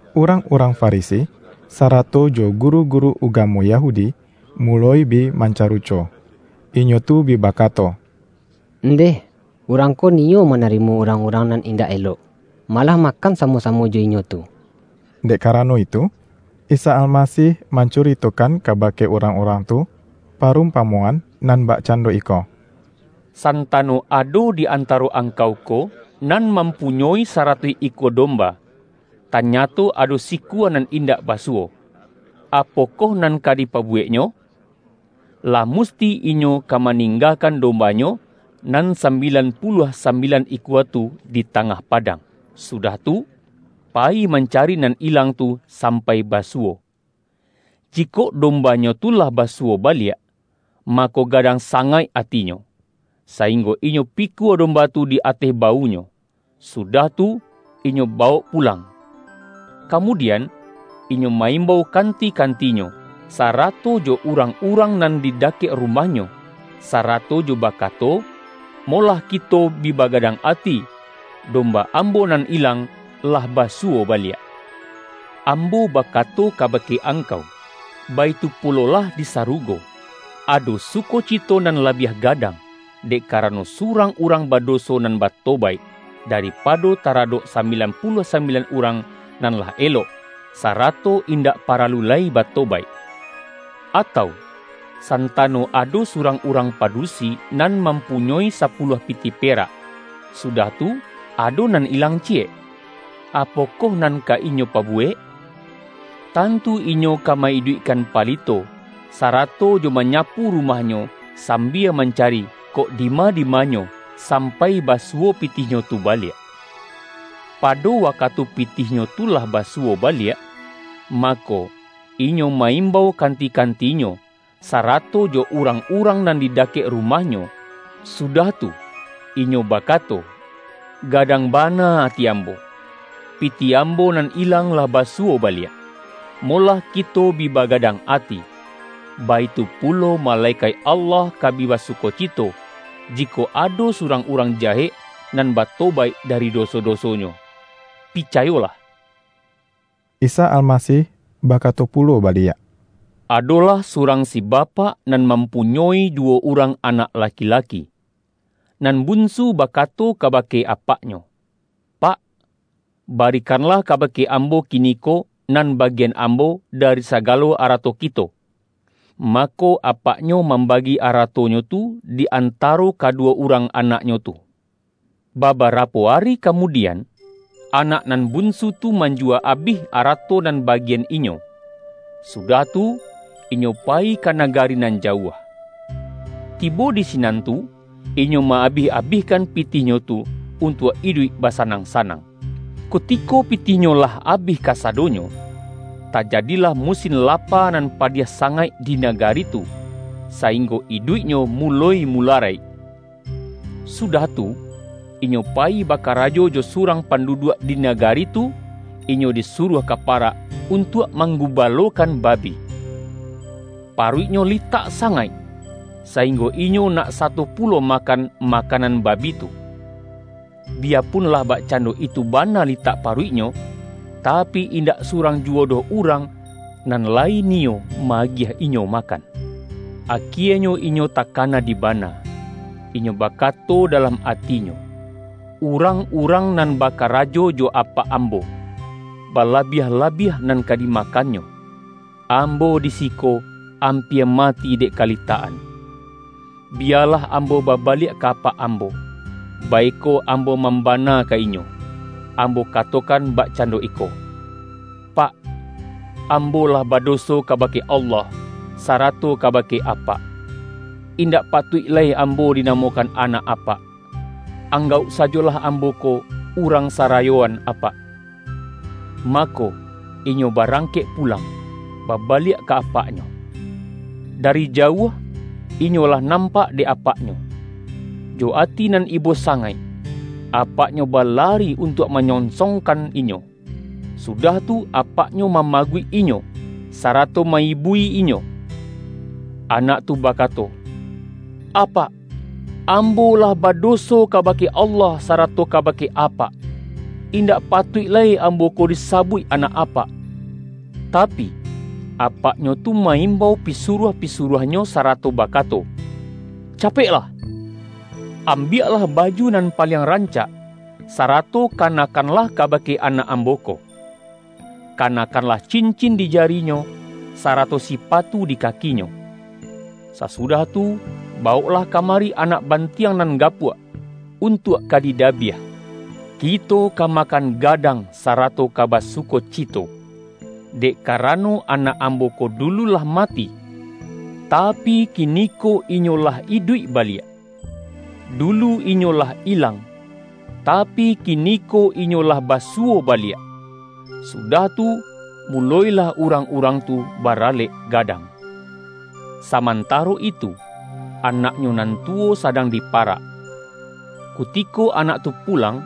Urang-urang Farisi, sarato jo guru-guru ugamo Yahudi, muloi bi manca-ruco. Inyo tu bi bakato,”Ndeh, Urang ko niyo manarimo urang-urang nan in-dak elok, malah makan samo-samo jo inyo tu!” Dek karano itu, Isa Almasih mancuritokan kabake urang-urang tu, parumpamoan nan bakcando iko, ”Santano ado di antaro angkau ko, nan mampunyoi saratuih ikua domba, tanyato ado sikua nan indak basuwo — apokoh nan ka dipabuweknyo? Lah musti inyo ka maninggakan domba-nyo, nan sambilan puluah sambilan ikua tu, di tangah padang, sudah tu, payi mancari nan ilang tu sampai ba-suwo. Jikok dombanyo tu lah basuwo baliak, mako, gadang sangaik atinyo, sainggo inyo pikua domba tu di ateh bawunyo, sudah tu, inyo bawok pu-lang. Kamudian inyo ma-imbau kan-ti-kantinyo, sarato jo urang-urang nan di dakek rumahnyo, sarato jo bakato, ’ Molah kito bi bagadang ati. Domba ambo nan ilang lah basuwo baliak!' Ambo bakato kabake angkau, baitu pulolah di sarugo, ado sukocito nan la-biah gadang, dek karano surang urang badoso nan batobaik, daripado tara-dok sambilan puluah sambilan urang, nan lah elok, sarato indak paralu lai batobaik.” ”Atau, santano ado surang urang padusi, nan mampunyoi sapuluah pitih perak, sudah tu, ado nan ilang ciyek — apokoh nan ka inyo pabuwek? Tan-tu inyo ka ma-iduikkan palito, sarato jo manyapu rumahnyo, sambia man-cari kok dima-dimanyo, sampai basu-wo pitihnyo tu baliak. Pado wakatu pitihnyo tu lah basuwo baliak, mako, inyo ma-imbau kanti-kantinyo, sarato jo urang-urang nan di dakek rumah-nyo, sudah tu, inyo bakato, ’Gadang bana ati ambo, pitih ambo nan ilang lah basuwo baliak. Molah kito bi ba-gadang ati!' Baitu pulo, malekaik Allah ka bi basukocito, jikok ado su-rang urang jahek, nan batobaik dari doso-dosonyo. Picayolah!” Isa Almasih bakato pulo baliak,”Adolah surang si bapak, nan mampu-nyoi duwo urang anak laki-laki. Nan bunsu bakato kabake apaknyo, ’Pak, barikanlah kabake ambo kiniko, nan bagian ambo dari sagalo arato kito.’ Mako, apaknyo mambagi aratonyo tu, di antaro kaduwo urang anaknyo tu. Babarapo ari kamudian, anak nan bunsu tu, manjuwa abih arato nan ba-gian inyo, sudah tu, inyo payi ka na-gari nan jauah. Tibo di sinan tu, inyo ma-abih-abihkan pitihnyo tu, untuak iduik basanang-sanang. Kutiko pitih-nyo lah abih kasadonyo, tajadilah mu-sin lapa nan padiah sangaik di nagari tu, sainggo iduiknyo muloi mularaik. Sudah tu, inyo payi bakarajo jo su-rang panduduak di nagari tu, inyo di-suruah ka parak untuak manggubalo-kan babi. Paruiknyo litak sangaik, sainggo inyo nak sato pulo makan ma-kanan babi tu. Biyapun lah bakcando itu bana litak paruiknyo, tapi, indak surang juwo doh urang nan layi ni-yo ma-agiah inyo makan. Akienyo inyo takana dibana, inyo bakato da-lam atinyo, ’Urang-urang nan bakara-jo jo apak ambo, balabiah-labiah nan ka dimakannyo, ambo di siko ampia mati dek kalitak-an! Biyalah ambo babaliak ka apak ambo, baiko ambo mambana ka inyo, ambo katokan bak-cando iko: Pak, ambo lah badoso kaba-ke Allah, sarato kabake apak. Indak patuik lai ambo dinamokan anak apak. Anggauk sajolah ambo ko urang sara-yoan apak.’ Mako, inyo barangkek pulang, babaliak ka apaknyo. Dari jauah, inyo lah nampak dek apak-nyo. Jo ati nan ibo sangaik, apaknyo ba-lari untuak manyonsongkan inyo, su-dah tu apaknyo mamaguik inyo, sarato ma-ibui inyo. Anak tu bakato, ’Apak, ambo lah badoso kabake Allah sarato kabake apak. Indak patuik lai ambo ko disabuik anak apak.’ Tapi, apaknyo tu ma-imbau pisuruah-pisuruahnyo sarato bakato, ’Capeklah! Ambiaklah baju nan paliang rancak, sarato kanakkanlah ka-bake anak ambo ko. Kanakkanlah cin-cin di jarinyo, sarato sipatu di kakinyo. Sasudah tu, bawoklah kamari anak bantiang nan gapuak, untuak ka dida-biah. Kito ka makan gadang, sarato ka basukocito. Dek karano, anak ambo ko dulu lah mati, tapi, kiniko inyo lah iduik baliak; dulu inyo lah ilang, ta-pi, kiniko inyo lah basuwo baliak.’ Su-dah tu, mulo-ilah urang-urang tu ba-ralek gadang. Samantaro itu, anaknyo nan tu-wo sadang di parak. Kutiko anak tu pulang,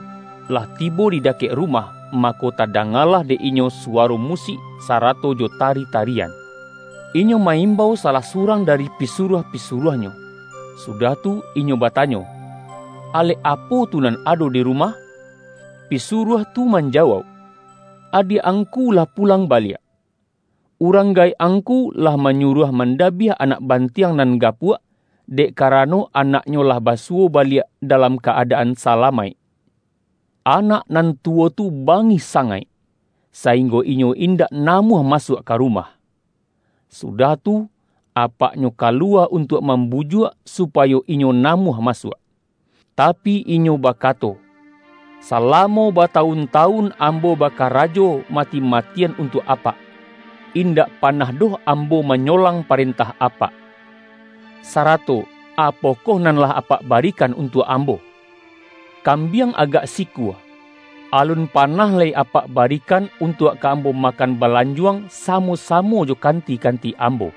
lah tibo di dakek rumah, ma-ko tadangalah dek inyo suwaro musik sarato jo tari-tarian. Inyo ma-im-bau salah surang dari pisuruah-pi-suruahnyo, sudah tu, inyo batanyo, Alek apo tu nan ado di rumah?' Pisuruah tu manjawauk, ’Adiak ang-ku lah pulang baliak! Urang gaek ang-ku, lah manyuruah mandabiah anak bantiang nan gapuak, dek karano anak-nyo lah basuwo baliak dalam ka-ada-an salamaik!' Anak nan tuwo tu bangih sangaik, sainggo inyo indak namuah masuak ka rumah. Sudah tu, apaknyo kaluwa un-tuak mambujuak, supayo inyo namuah masuak. Tapi, inyo bakato, ’Salamo batawun-tawun ambo bakarajo ma-ti-matian untuak apak. Indak panah doh ambo manyolang parentah apak. Sarato apokoh nan lah apak barikan untuak ambo? Kambiang agak sikua, alun panah lai apak barikan, untuak ka ambo makan balanjuang, samo-samo jo kanti-kanti ambo!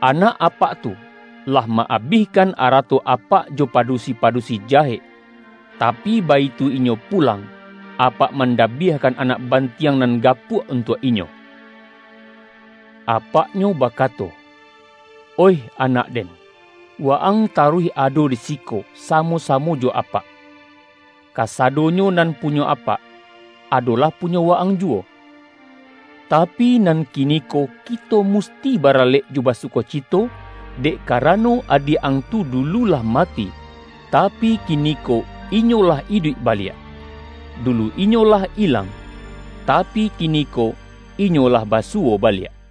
Anak apak tu, lah ma-abihkan arato apak jo padusi-padusi jahek, tapi, baitu inyo pulang, apak mandabiahkan anak bantiang nan gapuak untuak inyo!' Apaknyo bakato, ’Oih anak den, wa-ang taruih ado di siko, samo-samo jo apak. Ka-sadonyo nan punyo apak, adolah pu-nyo wa-ang juwo. Tapi, nan kiniko kito musti baralek jo basukocito, dek karano, adiak ang tu dulu lah mati, tapi, kiniko inyo lah iduik baliak; du-lu inyo lah ilang, tapi, kiniko inyo lah basuwo baliak.’”